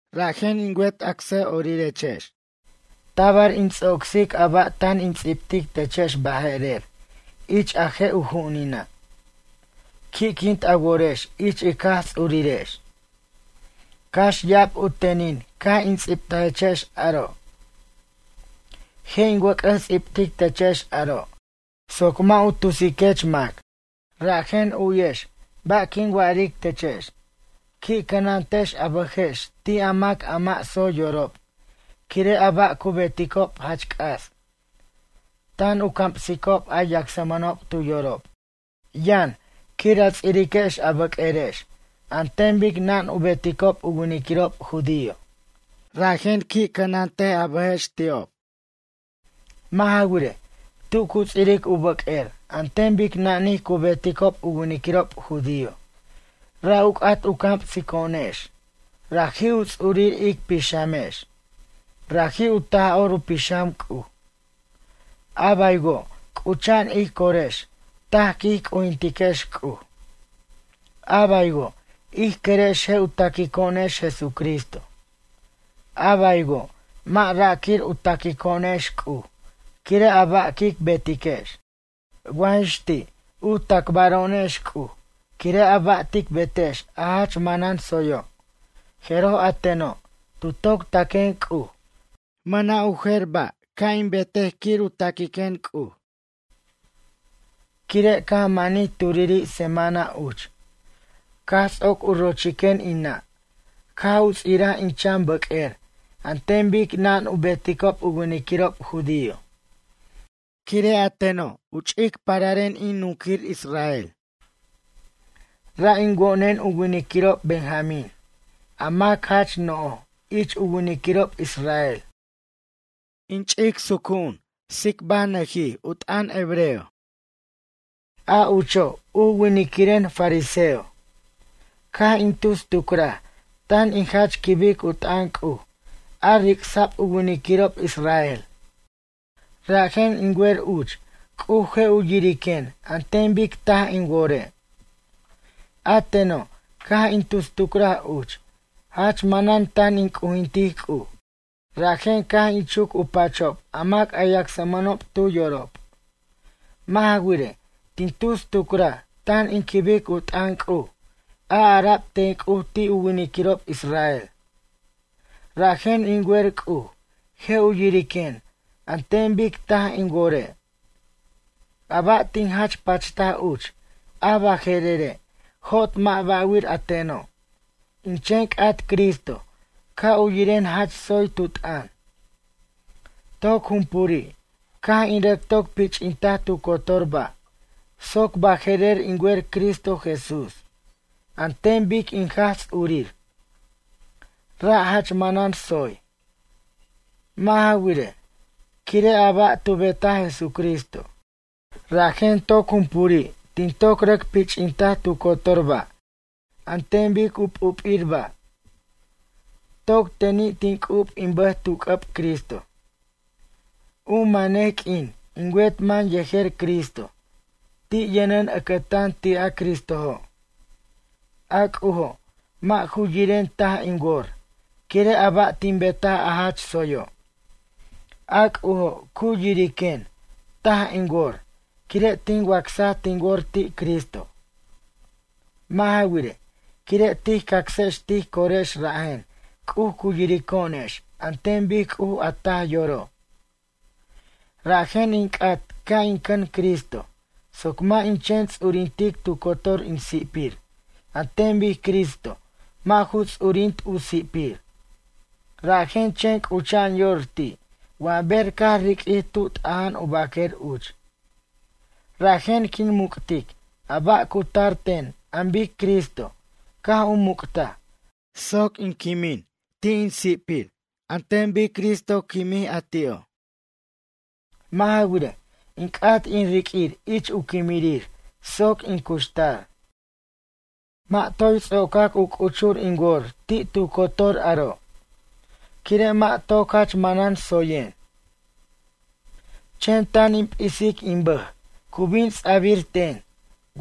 Rajen in wet acsʌ'orirex, tabar in ts'ocsic a ba' tan in ts'ibtic techex baje'rer ich a je' u ju'unina'. Qui'quint a worex ich ic Jaj Ts'urirex. Cax ya'ab u tenin caj in ts'ibtajechex aro'. Je' in wʌc'ʌs ts'ibtic techex aro' soc mʌ' u tusiquex mac. Rajen u'yex ba' quin wa'aric techex. Qui' cʌnantex a bʌjex ti' a mac a mʌ' tsoy yorob quire' a ba' cu beticob jach c'as. Tan u camsicob a yacsmʌnob tu yorob: “Yʌn, quir a ts'iriquex a bʌq'uerex an ten bic nan u beticob u winiquirob judío.” Rajen qui' cʌnant a bʌjex ti'ob. Mʌ' ja wirej, tu cu ts'iric u bʌq'uer an ten bic nanij cu beticob u winiquirob judío ra' u c'at u camsico'onex raji' u ts'urir ic pixamex, raji' u Taj'or u Pixam C'uj. A baywo' c'ucha'an ij corex taj quij c'ujintiquex C'uj. A baywo' ij querex je' u taquico'onex Jesucristo. A baywo' mʌ' ra' quir u taquico'onex C'uj quire' a ba' quic betiquex. Wa jix ti' u tacbaro'onex C'uj quire' a ba' tic betex a jach manan tsoyo', jeroj a teno', tu toc taquen C'uj mʌna' u jer ba' ca' in betej quir u taquiquen C'uj. Quire' caj manij turiri' semana uch. Caj ts'oc u rochiquen in nʌ' caj u ts'iraj in chan bʌq'uer an ten bic nan u beticob u winiquirob judío. Quire' a teno' u ch'ic pararen in nunquir Israel. Ra' in wo'nen u winiquirob benjamín, a mac jach no'j ich u winiquirob israel. In ch'ic sucu'un tsicbajnʌjij u t'ʌn hebreo. A ucho' u winiquiren fariseo. Caj in tus tucraj tan in jach quibic u t'ʌn C'uj a ric'sa'b u winiquirob israel. Rajen in wer uch C'uj je' u yiriquen an ten bic taj in wore'. A teno' caj in tus tucraj uch jach manan tan in c'ujintic C'uj. Rajen caj in chuc u pachob a mac a yacsmʌnob tu yorob. Mʌ' ja wirej, tin tus tucraj tan in quibic u t'ʌn C'uj a ara'b ten C'uj ti' u winiquirob israel, rajen in wer C'uj je' u yiriquen an ten bic taj in wore'. A ba' tin jach pachtaj uch a baje'rere', jot mʌ' ba'wir a teno'. In chen c'at Cristo ca' u yiren jach tsoy tu t'ʌn. Toc jumpuri' caj in rʌc toc pich'intaj tu cotor ba' soc baje'rer in wer Cristo Jesús an ten bic in Jaj Ts'urir. Ra' jach manan tsoy. Mʌ' ja wirej, quire' a ba' tu betaj Jesucristo, rajen toc jumpuri' tin toc rʌc pich'intaj tu cotor ba' an ten bic u p'up'ir ba'. Toc teni' tin c'ub in bʌj tu c'ʌb Cristo. U manej q'uin in wet man yejer Cristo, ti' yʌnen ʌcʌtan ti' a Cristojo'. A C'ujo' mʌ' ju yiren taj in wor quire' a ba' tin betaj a jach tsoyo'. A C'ujo', cu yiriquen taj in wor quire' tin wacsaj tin wor ti' Cristo. Mʌ' ja wirej, quire' tij cacsex tij corex rajen C'uj cu yirico'onex an ten bic C'uj a taj yoro'. Rajen in c'at ca' in cʌn Cristo soc mʌ' in chen ts'urintic tu cotor in si'pir an ten bic Cristo mʌ' ju ts'urint u si'pir, rajen chen c'ucha'an yor ti' wa ber caj riq'uij tu t'aja'an u baquer uch. Rajen quin muc'tic a ba' cu tar ten an bic Cristo caj u muc'taj soc quin quimij ti' in si'pir an ten bic Cristo quimij a ti'o'. Mʌ' ja wirej, in c'at in riq'uir ich u quimirir soc in cuxtar. Mʌ' toy ts'ocac u c'uchur in wor ti' tu cotor aro', quire' mʌ' toc jach manan tsoyen. Chen tan in p'isic in bʌj cu bin ts'a'bir ten,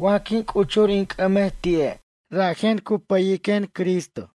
wa quin c'uchur in c'ʌmej ti'e' rajen cu pʌyen Cristo.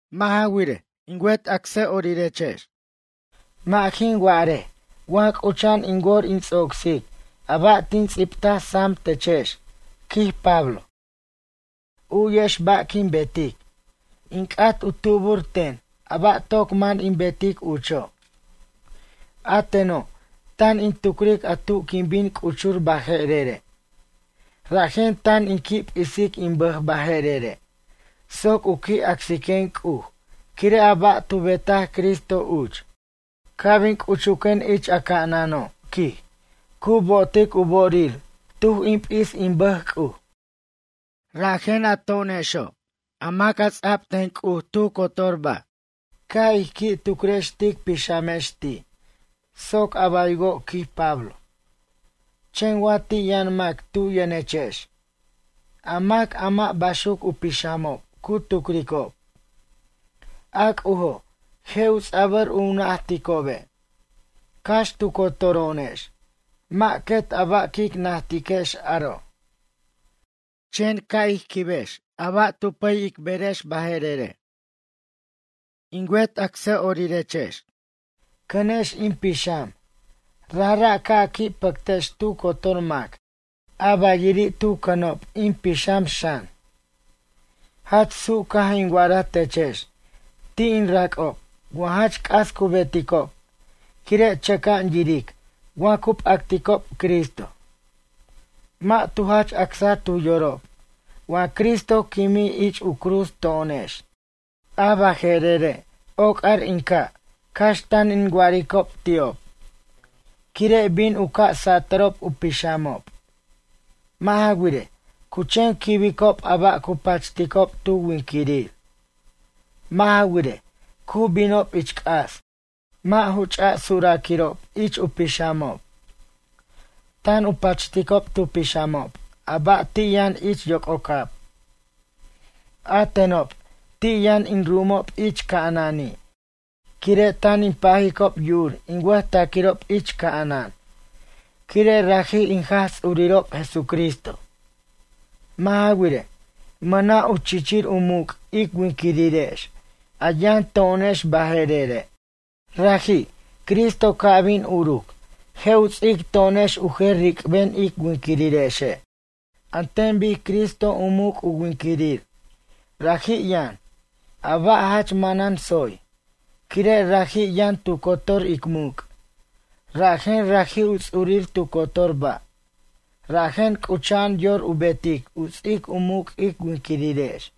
Mʌ' ja wirej, in wet acsʌ'orirex, mʌ' jin wa'arej wa c'ucha'an in wor in ts'ocsic a ba' tin ts'ibtaj sam techex, quij Pablo. U'yex ba' quin betic, in c'at u tubur ten a ba' toc man in betic ucho'. A teno' tan in tucric a tu quin bin c'uchur baje'rere'. Rajen tan in qui' p'isic in bʌj baje'rere' soc u qui' acsiquen C'uj quire' a ba' tu betaj Cristo uch. Ca' bin c'uchuquen ich a ca'anano', quij, cu bo'otic u bo'orir tuj in p'is in bʌj C'uj. Rajen a to'onexo' a mac a ts'a'b ten C'uj tu cotor ba', ca' ij qui' tucrex tic pixamex ti' soc a baywo' quij Pablo. Chen wa ti' yʌn mac tu' yʌnechex, a mac a mʌ' baxuc u pixamob cu tucricob, a C'ujo' je' u ts'a'bʌr u najticobe'. Cax tu cotoro'onex mʌ' quet a ba' quic najtiquex aro'. Chen ca' ij quibex a ba' tu pʌy ic berex baje'rere'. In wet acsʌ'orirex, cʌnex in pixam, rajra' ca' a qui' pʌctex tu cotor mac a bayiri' tu cʌnob in pixam xan. Jach su' caj in wa'araj techex ti' in rac'ob wa jach c'as cu beticob quire' chʌca'an yiric wa cu p'acticob Cristo. Mʌ' tu jach acsa tu yorob wa Cristo quimij ich u cruz to'onex. A baje'rere' oc'ar in ca' cax tan in wa'aricob ti'ob. Quire' bin u ca' satʌrob u pixamob. Mʌ' ja wirej, cu chen quibicob a ba' cu pachticob tu winquirir. Mʌ' ja wirej, cu binob ich c'as, mʌ' ju ch'a suraquirob ich u pixamob. Tan u pachticob tu pixamob a ba' ti' yʌn ich yoc'ocab. A tenob ti' yʌn in ru'umob ich ca'anani' quire' tan in pajicob yu'ur in wʌjtaquirob ich ca'anan quire' raji' in Jaj Ts'urirob Jesucristo. Mʌ' ja wirej, mʌna' u chichir u muc' ic winquirirex a yʌn to'onex baje'rere'. Raji', Cristo ca' bin uruc, je' u ts'ic to'onex u jer ric'ben ic winquirirexe' an ten bic Cristo u muc' u winquirir raji' yʌn, a ba' jach manan tsoy, quire' raji' yʌn tu cotor ic muc', rajen raji' u ts'urir tu cotor ba', rajen c'ucha'an yor u betic u ts'ic u muc' ic winquirirex.